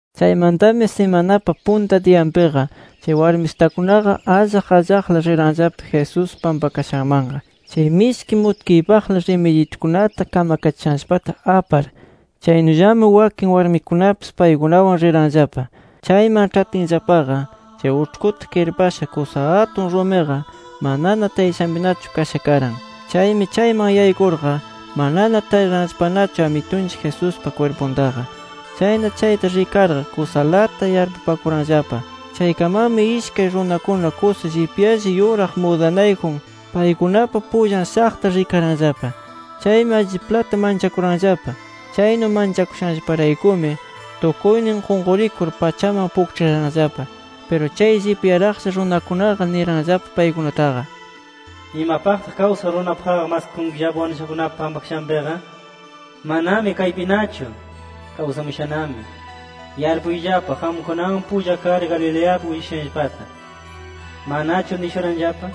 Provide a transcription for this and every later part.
Chaymantami simanapa punta diyanpiqa, chay warmisitakunaqa allaq allaqla riranllapa Jesús pampakashanmanqa, chay mishki mutkiypaqla rimidyitukunata kamkachishanllapata apar. Chaynullami wakin warmikunapis paykunawan riranllapa. Chayman ĉhatinllapaqa, chay uĉhkuta kirpasha kusa atun rumiqa manana tayashanpinachu kasha karan. Chaymi chayman yaykurqa manana tariranllapanachu Amitunchik Jesuspa kwirpuntaqa. Chayna chayta rikarqa, kusalata yarpupakuranllapa. Chaykamanmi ishkay runakuna kusa llipyalla yuraq mudanayjun paykunapa pullan shaqta rikaranllapa. Chaymi alliplata manchakuranllapa. Chaynu manchakushanllaparaykumi, tukuynin qunqurikur pachaman pukĉhiraranllapa. Piru chay llipyaraqlla runakunaqa niranllapa paykunataqa: —¿Imapaqtaq kawsaq runapaqqa, maskakunkillapa wanushakunapa pampakashanpiqa? Manami kaypinachu. Kawsamushanami. Yarpuyllapa qamkunawan pulla kar Galileapi willashushanllapata. ¿Manachu nishuranllapa: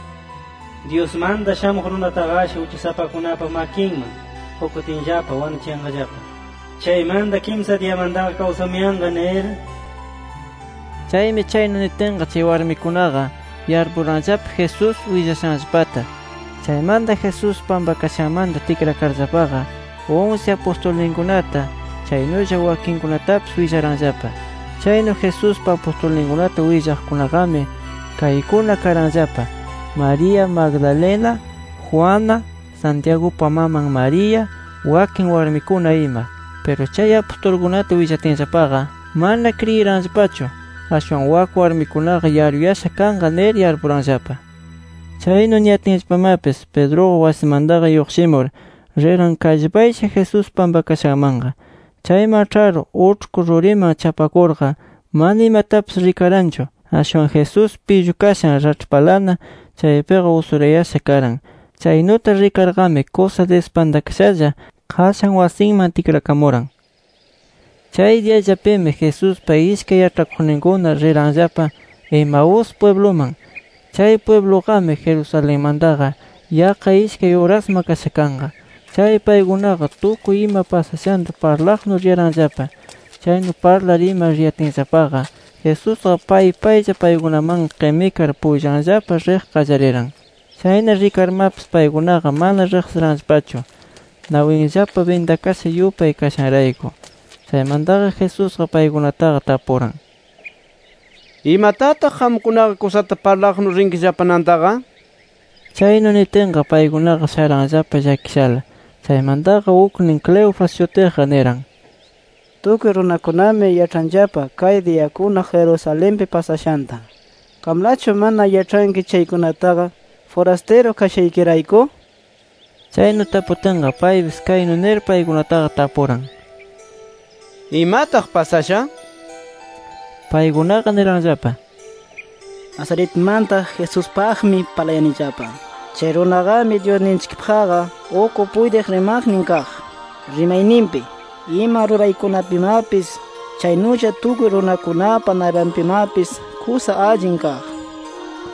Dyusmanta Shamuq Runataqashi uchasapakunapa makinman qukutinllapa wanuchiyanqallapa; chaymanta kimsa diyamantaqa kawsamuyanqa nir? Chaymi, chaynu nitinqa, chay warmikunaqa yarpuranllapa Jesús willashanllapata. Chaymanta Jesús pampakashanmanta tikrakarllapaqa, unsi apustulninkunata, chaynulla wakinkunatapis willaranllapa. Chaynu Jesuspa apustulninkunata willaqkunaqami kaykuna karanllapa: María Magdalena, Juana, Santiagupa maman María, wakin warmikuna ima. Piru chay apustulkunata willatinllapaqa, mana kriyiranllapachu. Ashwan wak warmikunaqa yaruyasha kanqa nir yarpuranllapa. Chaynu niyatinllapamapis, Pedruqa wasimantaqa lluqshimur riran kallpaylla Jesús pampakashanmanqa. Chayman ĉhar uĉhku ruriman chapakurqa, mana imatapis rikaranchu. Ashwan Jesús pillukashan raĉhpalana chaypiqa usurayasha karan. Chaynuta rikarqami kusa dispantakashalla qashan wasinman tikrakamuran. Chay diyallapimi Jesuspa ishkay yaĉhakuqninkuna riranllapa Emaus pwibluman. Chay pwibluqami, Jerusalenmantaqa yaqqa ishkay urasma kasha kanqa. Chay paykunaqa, tukuy ima pasashanta parlaqnu riyaranllapa. Chaynu parlar ima riyatinllapaqa, Jesusqa pay paylla paykunamanqa qimikar pullanllapa riq qallariran. Chayna, rikarmapis paykunaqa mana riqsiranllapachu, nawinllapa bindakasha yupay kashanrayku. Chaymantaqa Jesusqa paykunataqa tapuran: —¿Imatataq qamkunaqa kusata parlaqnu riyankillapa nantaqa? Chaynu nitinqa, paykunaqa sharanllapa llakishala. Chaymantaqa uknin Cleofas shutiqqa niran: —Tukuy runakunami yaĉhanllapa kay diyakuna Jerusalenpi pasashanta. ¿Qamlachu mana yaĉhanki chaykunataqa, furastiru kashaykirayku? Chaynu taputinqa, paypis kaynu nir paykunataqa tapuran: —¿Imataq pasasha? Paykunaqa niranllapa: —Nazaretmanta Jesuspaqmi parlayanillapa. Chay runaqami Dyusninchikpaqqa uk puytiq rimaqnin kaq, rimayninpi, ima ruraykunapimapis. Chaynulla tukuy runakunapa naypanpimapis kusa allin kaq.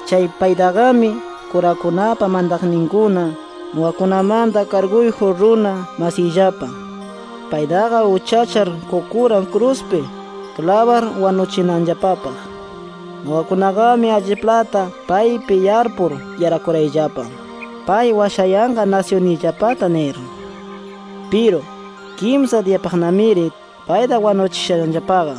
Chay paytaqami kurakunapa mantaqninkuna, nuqakunamanta karguyjun runa masiyllapa, paytaqa uchachar qukuran kruspi klabar wanuchinanllapapaq. Nuqakunaqami alliplata paypi yarpur yarakuyarayllapa, pay washayanqa nasyunniyllapata nir. Piru, kimsa diyapaqnamiri payta wanuchishanllapaqa.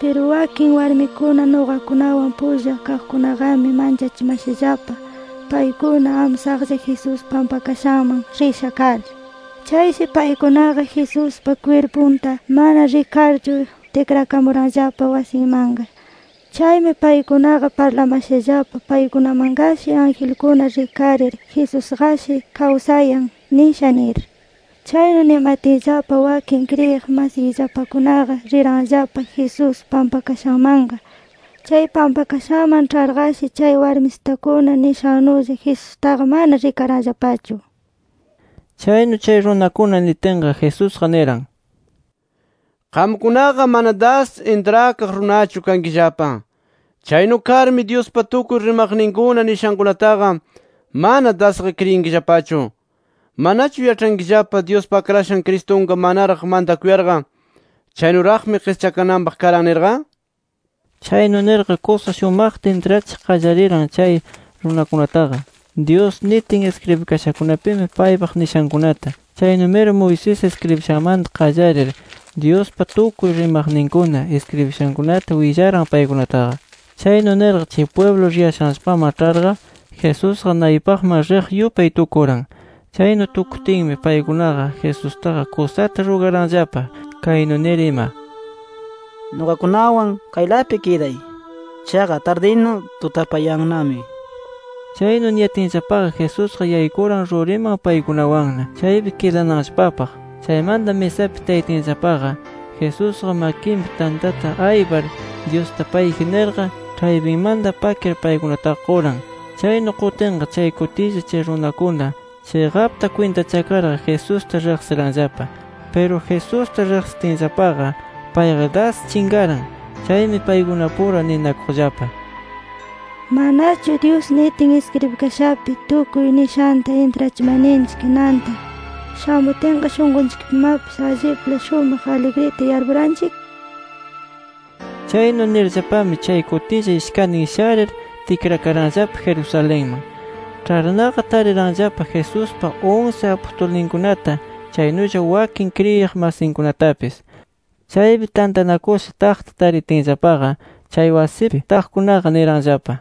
“Piru wakin warmikuna, nuqakunawan pulla kaqkunaqami manchachimashallapa, paykuna amsaqlla Jesús pampakashanman risha kar. Chayshi paykunaqa Jesuspa kwirpunta mana rikarchu tikrakamuranllapa wasinmanqa. Chaymi paykunaqa parlamashallapa, paykunamanqashi angelkuna rikarir, Jesusqashi kawsayan nisha nir. Chaynu nimatinllapa, wakin kriyiq masiyllapakunaqa riranllapa Jesús pampakashanmanqa. Chay pampakashanman ĉharqashi chay warmisitakuna nishannulla, Jesustaqa mana rikaranllapachu”. Chaynu chay runakuna nitinqa, Jesusqa niran: —¡Qamkunaqa mana das intrakaq runachu kankillapa! Chaynu karmi Dyuspa tukuy rimaqninkuna nishankunataqa, mana dasqa kriyinkillapachu. ¿Manachu yaĉhayankillapa, Dyuspa Akrashan Cristunqa manaraq mantakuyarqa, chaynuraqmi qischakananpaq karan nirqa? Chaynu nirqa kusa shumaqta intrachiq qallariran chay runakunataqa, Dyus nitin iskribikashakunapi paypaq nishankunata. Chaynumiri Moisés iskribishanmanta qallarir, Dyuspa tukuy rimaqninkuna iskribishankunata willaran paykunataqa. Chaynu nirqa chay pwiblu riyashanllapaman ĉharqa, Jesusqa naypaqman riq yupay tukuran. Chaynu tukutinmi, paykunaqa Jesustaqa kusata rugaranllapa, kaynu nir ima: —Nuqakunawan kaylapi kiday. Chaqa tardina, tutapayannami. Chaynu niyatinllapaqa, Jesusqa yaykuran ruriman, paykunawanna chaypi kidananllapapaq. Chaymanta misapina tayatinllapaqa, Jesusqa makinpi tantata aypar Dyusta payji nirqa, ĉhaypinmanta pakir paykunataqa quran. Chaynu qutinqa, chay kutilla chay runakuna chiqapta kwintachakarnaqa, Jesusta riqsiranllapa. Piru Jesusta riqsitinllapaqa, payqa das chinqaran. Chaymi paykunapura ninakuqllapa: “¿Manachu Dyus nitin iskribikashapi tukuy nishanta intrachimarninchik nanta shamutinqa, shunqunchikpimapis allipla shumaq aligrita yarpuranchik?” Chaynu nirllapami, chay kutilla ishkantin sharir tikrakaranllapa Jerusalenman. Ĉharnaqa tariranllapa Jesuspa unsi apustulninkunata, chaynulla wakin kriyiq masinkunatapis. Chaypi tantanakusha taqta taritinllapaqa, chay wasipi taqkunaqa niranllapa: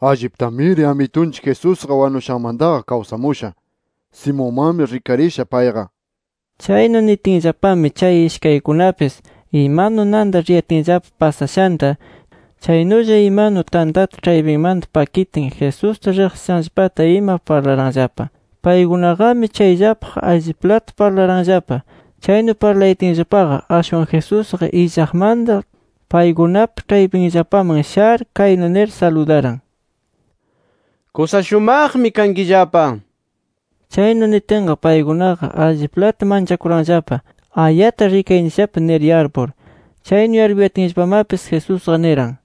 —Alliptamiri Amitunchik Jesusqa wanushanmantaqa kawsamusha. Simonmanmi rikarisha payqa nir. Chaynu nitinllapami chay ishkaykunapis imanu nanta riyatinllapa pasashanta, chaynulla imanu tantata ĉhaypinmanta pakitin Jesusta riqsishanllapata ima parlaranllapa. Paykunaqami chayllapaq alliplata parlayaranllapa. Chaynu parlayatinllapaqa ashwan Jesusqa illaqmanta paykunapa ĉhaypinllapaman shar kaynu nir saludaran: —Kusa shumaqmi kankillapa nir. Chaynu nitinqa, paykunaqa alliplata manchakuranllapa, ayata rikayanchikllapa nir yarpur. Chaynu yarpuyatinllapamapis Jesusqa niran: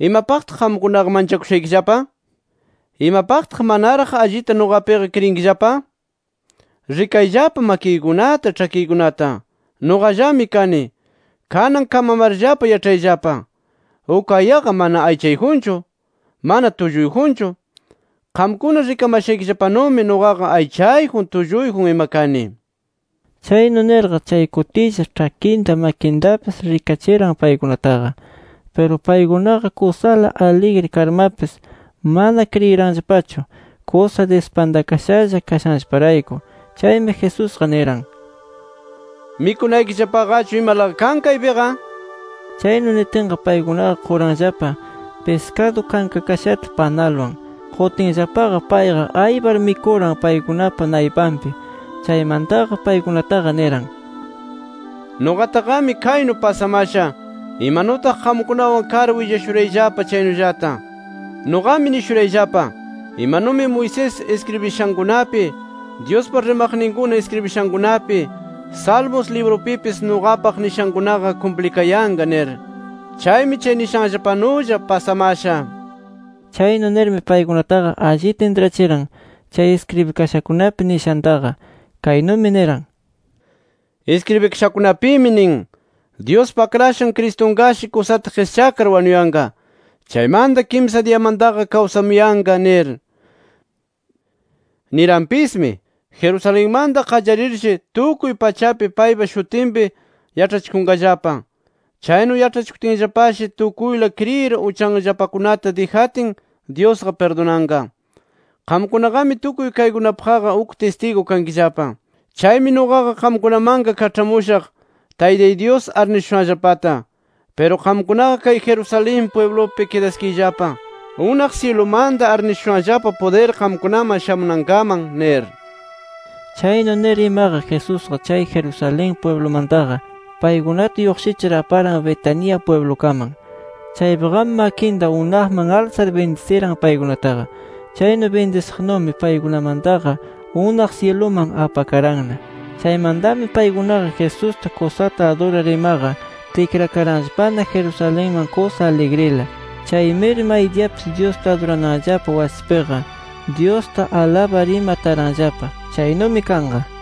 —¿Imapaqtaq qamkunaqa manchakushaykillapa? ¿Imapaqtaq manaraq allita nuqapiqa kriyinllapa? Rikayllapa makiykunata, ĉhakiykunata. Nuqallami kani. Kanan kamamarllapa yaĉhayllapa: Uk ayaqa mana aychayjunchu, mana tulluyjunchu. Qamkuna rikamashaykillapanumi nuqaqa aychayjun, tulluyjun ima kani. Chaynu nirqa chay kutilla, ĉhakinta makintapis rikachiran paykunataqa. Piru paykunaqa kusala aligri karmapis mana kriyiranllapachu kusa dispantakashalla kashanllaparayku. Chaymi Jesusqa niran: —¿Mikunaykillapaqachu imalaqa kan kaypiqa? nir. Chaynu nitinqa paykunaqa quranllapa piskadu kankakashata, [panalwan]. Qutinllapaqa payqa aypar mikuran, paykunapa naypanpi. Chaymantaqa paykunataqa niran: “Nuqataqami kaynu pasamasha, imanutaq qamkunawan kar willashurayllapa chaynullata. Nuqami nishurayllapa, imanumi Moisés iskribishankunapi, Dyuspa rimaqninkuna iskribishankunapi, Salmos librupipis nuqapaq nishankunaqa kumplikayanqa nir. Chaymi chay nishanllapanulla pasamasha”. Chaynu nirmi paykunataqa allita intrachiran, chay iskribikashakunapi nishantaqa. Kaynumi niran: “Iskribikashakunapimi nin: Dyuspa Akrashan Cristunqashi kusata qischakar wanuyanqa. Chaymanta kimsa diyamantaqa kawsamuyanqa nir”. Niranpismi: “Jerusalenmanta qallarirshi tukuy pachapi paypa shutinpi yaĉhachikunqallapa. Chaynu yaĉhachikutinllapashi tukuyla kriyir uchanllapakunata dijatin Dyusqa pirdunanqa. Qamkunaqami tukuy kaykunapaqqa uk tistigu kankillapa. Chaymi nuqaqa qamkunamanqa kaĉhamushaq Taytay Dyus arnishushanllapata. Piru qamkunaqa kay Jerusalén pwiblupi kidaskiyllapa, unaq syilumanta arnishushanllapa pudir qamkunaman shamunankaman” nir. Chaynu nir imaqa, Jesusqa chay Jerusalén pwiblumantaqa, paykunata lluqshichir aparan Betania pwiblukaman. Chaypiqami makinta unaqman alsar bindisiran paykunataqa. Chaynu bindisiqnumi, paykunamantaqa unaq syiluman apakaranna. Chaymantami paykunaqa Jesusta kusata adurar imaqa, tikrakaranllapana Jerusalenman kusa aligrila. Chaymiri maydiyapis, Dyusta adurananllapa wasipiqa, Dyusta alabar ima taranllapa. Chaynumi kanqa.